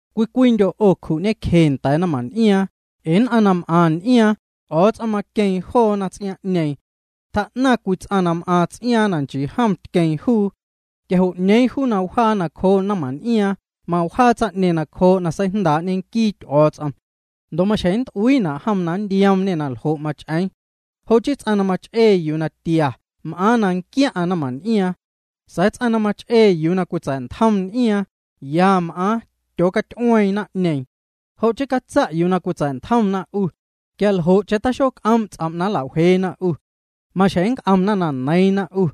Cwii cwiindyo' 'o cju'ñecje nda̱a̱ naⁿmaⁿn'iaaⁿ, ee nn'aⁿ na m'aⁿ n'iaaⁿ, Ty'o̱o̱ts'om maqueeⁿ joona ts'iaaⁿ'ñeeⁿ. Tjaa'naⁿ cwii ts'aⁿ na m'aaⁿ ts'iaaⁿ na nchii jom tqueeⁿ juu. Quia jo' 'ñeeⁿ juu na wjaa nacjoo naⁿmaⁿn'iaaⁿ, mawjaa tsaⁿ'ñeeⁿ nacjoo' na seijndaa'ñe nquii Ty'o̱o̱ts'om. Ndo' maxjeⁿ nnt'uiina' jom na nntioomñê na ljo' mach'eeⁿ. Jo' chii ts'aⁿ na mach'ee yuu na tia m'aaⁿ na nquiaⁿ'aⁿ naⁿmaⁿn'iaaⁿ. Sa̱a̱ ts'aⁿ na mach'ee yuu na cwitsa̱'ntjom n'iaaⁿ, ya m'aaⁿ, tyoocaty'ueeⁿ naⁿ'ñeeⁿ. Jo' chii catsa' yuu na cwitsa̱'ntjomna 'u, quia ljo'cheⁿ taxoc'oom' ts'om' aa nla'wjeena 'u. Maxjeⁿ nnc'omna na neiiⁿna 'u.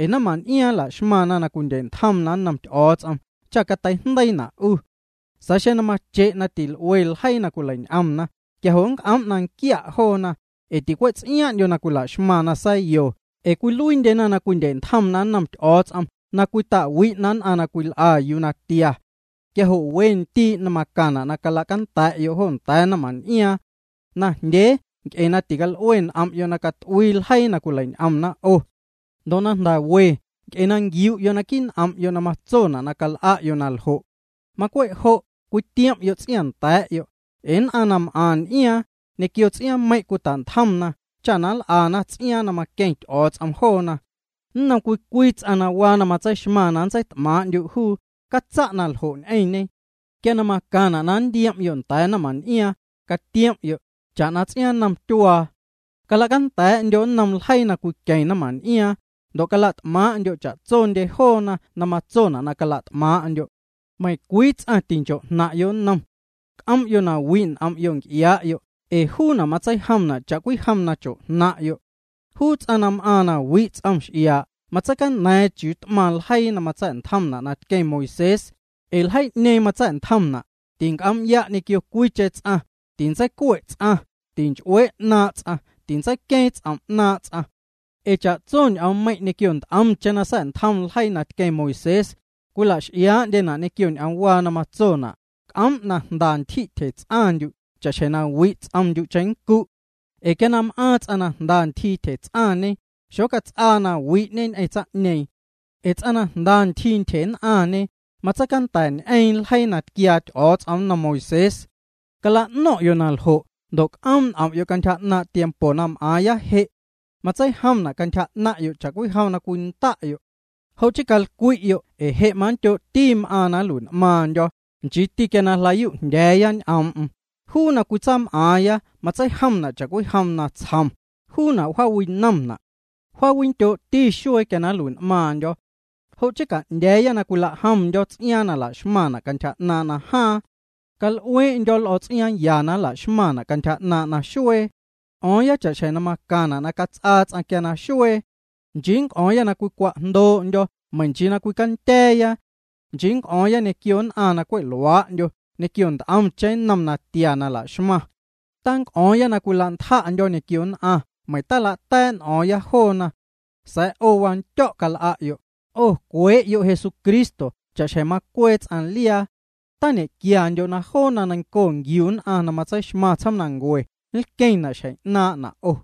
Ee naⁿmaⁿn'iaaⁿ la'xmaⁿna na cwindye'ntjomna nnom Ty'o̱o̱ts'om cha catei'jndeiina 'u. Sa̱a̱ xeⁿ mache' na til'uee ljeii na cwilein'omna, quia jo' c'oom' na nquia' joona, ee ticwe' ts'iaaⁿ'ndyo na la'xmaⁿna sa̱yo ee cwiluiindyena na cwindye'ntjomna nnom Ty'o̱o̱ts'om na cwita'wi'na nn'aⁿ na cwil'a yuu na tia. Quia jo' we ndii' macaⁿna' na cala'canda̱'yo' jo nda̱a̱ naⁿmaⁿn'iaaⁿ. Najndyee nc'e na tical'ue n'om'yo' na cat'uii ljeii na cwileiñ'omna 'o. Ndo' na jnda̱ we nc'e na nquiu'yo' naquii' n'om'yo' na matsona' na cal'a'yo' na ljo'. Macwe' jo' na cwitiom'yo' ts'iaaⁿnda̱a̱'yo', ee nn'aⁿ na m'aⁿ n'iaaⁿ, ñequio ts'iaaⁿmeiⁿ' cwita'ntjomna cha nl'ana ts'iaaⁿ na maqueⁿ Ty'o̱o̱ts'om joona. Nnom cwii cwii ts'aⁿ na waa na matseixmaⁿ na nntseit'maaⁿ'ndyu' juu, catsa' naljo' ñ'eⁿñe. Quia macaⁿna' na nntiom'yo' nda̱a̱ naⁿmaⁿn'iaaⁿ, catiom'yo', cha'na ts'iaaⁿ nnom tyuaa. Cala'canda̱'yo' nnom ljeii na cwiqueⁿ naⁿmaⁿn'iaaⁿ, ndo' cala't'maaⁿ'ndyo' cha'tsondye joona na matsona' na cala't'maaⁿ'ndyo'. Meiⁿncwii ts'aⁿ tincho'jnaⁿ'yo' nnom. C'om'yo' na wi' n'om'yo' nc'iaa'yo' ee juuna' matseijomna' cha'cwijom na cho'jnaⁿ'yo'. Juu ts'aⁿ na m'aaⁿ na wi' ts'om x'iaa', matseicaña̱a̱ⁿ chiuu t'maⁿ ljeii na matsa̱'ntjomna' na tqueⁿ Moisés, ee ljeii'ñeeⁿ matsa̱'ntjomna': “Tinc'om'ya' ñequio cwiicheⁿ ts'aⁿ, tintseicue' ts'aⁿ, tinch'uee' 'naaⁿ' ts'aⁿ, tintseiqueeⁿ ts'om' 'naaⁿ' ts'aⁿ.” Ee cha'tso ñ'oommeiⁿ' ñequio nt'omcheⁿ na sa̱'ntjom ljeii na tqueⁿ Moisés, cwila'x'iaa'ndye joona' ñequio ñ'oomwaa na matsona': “C'oom' na jnda ntyji' tyjets'aⁿndyu' cha'xjeⁿ na wi' ts'omndyu' cheⁿncu'.” Ee quia na m'aaⁿ ts'aⁿ na jnda ntyjii tyjets'aⁿñe, xocats'aa na wi'ñe ñ'eⁿ tsaⁿ'ñeeⁿ. Ee ts'aⁿ na jnda ntyjii ntyjenn'aⁿñe, matseicanda̱ñ'eeⁿ ljeii na tquiaa Ty'o̱o̱ts'om nnom Moisés. Cala'no̱ⁿ'yo' naljo' ndo' c'oom' n'om'yo' cantyja 'naaⁿ' tiempo na m'aaⁿya je'. Matseijomna' cantyja 'naⁿ'yo' cha'cwijom na cwinda'yo'. Jo' chii calcwi'yo' ee je' mandyoo'ti m'aaⁿna' na nlui'n'maaⁿndyo̱, nchiiti quia jlayuu'jndya̱a̱ ñ'oom'm. Juu na cwitsaam'aaⁿya matseijomna' cha'cwijom natsjom, juuna' wjaawinomna'. Wjaawindyoo'ti xuee quia na nlui'n'maaⁿndyo̱. Jo' chii ca'ndya̱a̱ na cwilajomndyo̱ ts'iaaⁿ na laxmaⁿna' cantyja 'naaⁿ' najaaⁿ. Cal'uee'ndyo̱ l'o̱ ts'iaaⁿ ya na laxmaⁿna' cantyja 'naaⁿ' naxuee. C'o̱o̱ⁿya cha'xjeⁿ na macaⁿna' na cats'aa ts'aⁿ quia naxuee. Nchii c'o̱o̱ⁿya na cwicwa'jndoo'ndyo̱ meiⁿ nchii na cwicandya̱a̱ya. Nchii c'o̱o̱ⁿ ñequio nn'aⁿ na cwe' luaa'ndyo ñequio nt'omcheⁿ nnom natia la'xmaⁿ. Tac'o̱o̱ⁿya na cwila'ntja'ndyo̱ ñequio nn'aⁿ meiⁿ tala'ta̱a̱' n'o̱o̱ⁿya joona. Sa̱a̱ 'o wandyo̱' cal'a'yo', 'o cwee'yo' Jesucristo cha'xjeⁿ macwee ts'aⁿ liaa. Tañe'quiandyo' na joo na neiⁿnco nquiu nn'aⁿ na matseixmaⁿ tsjoomnancue nlqueⁿna' xjeⁿ 'naaⁿ'na' 'o.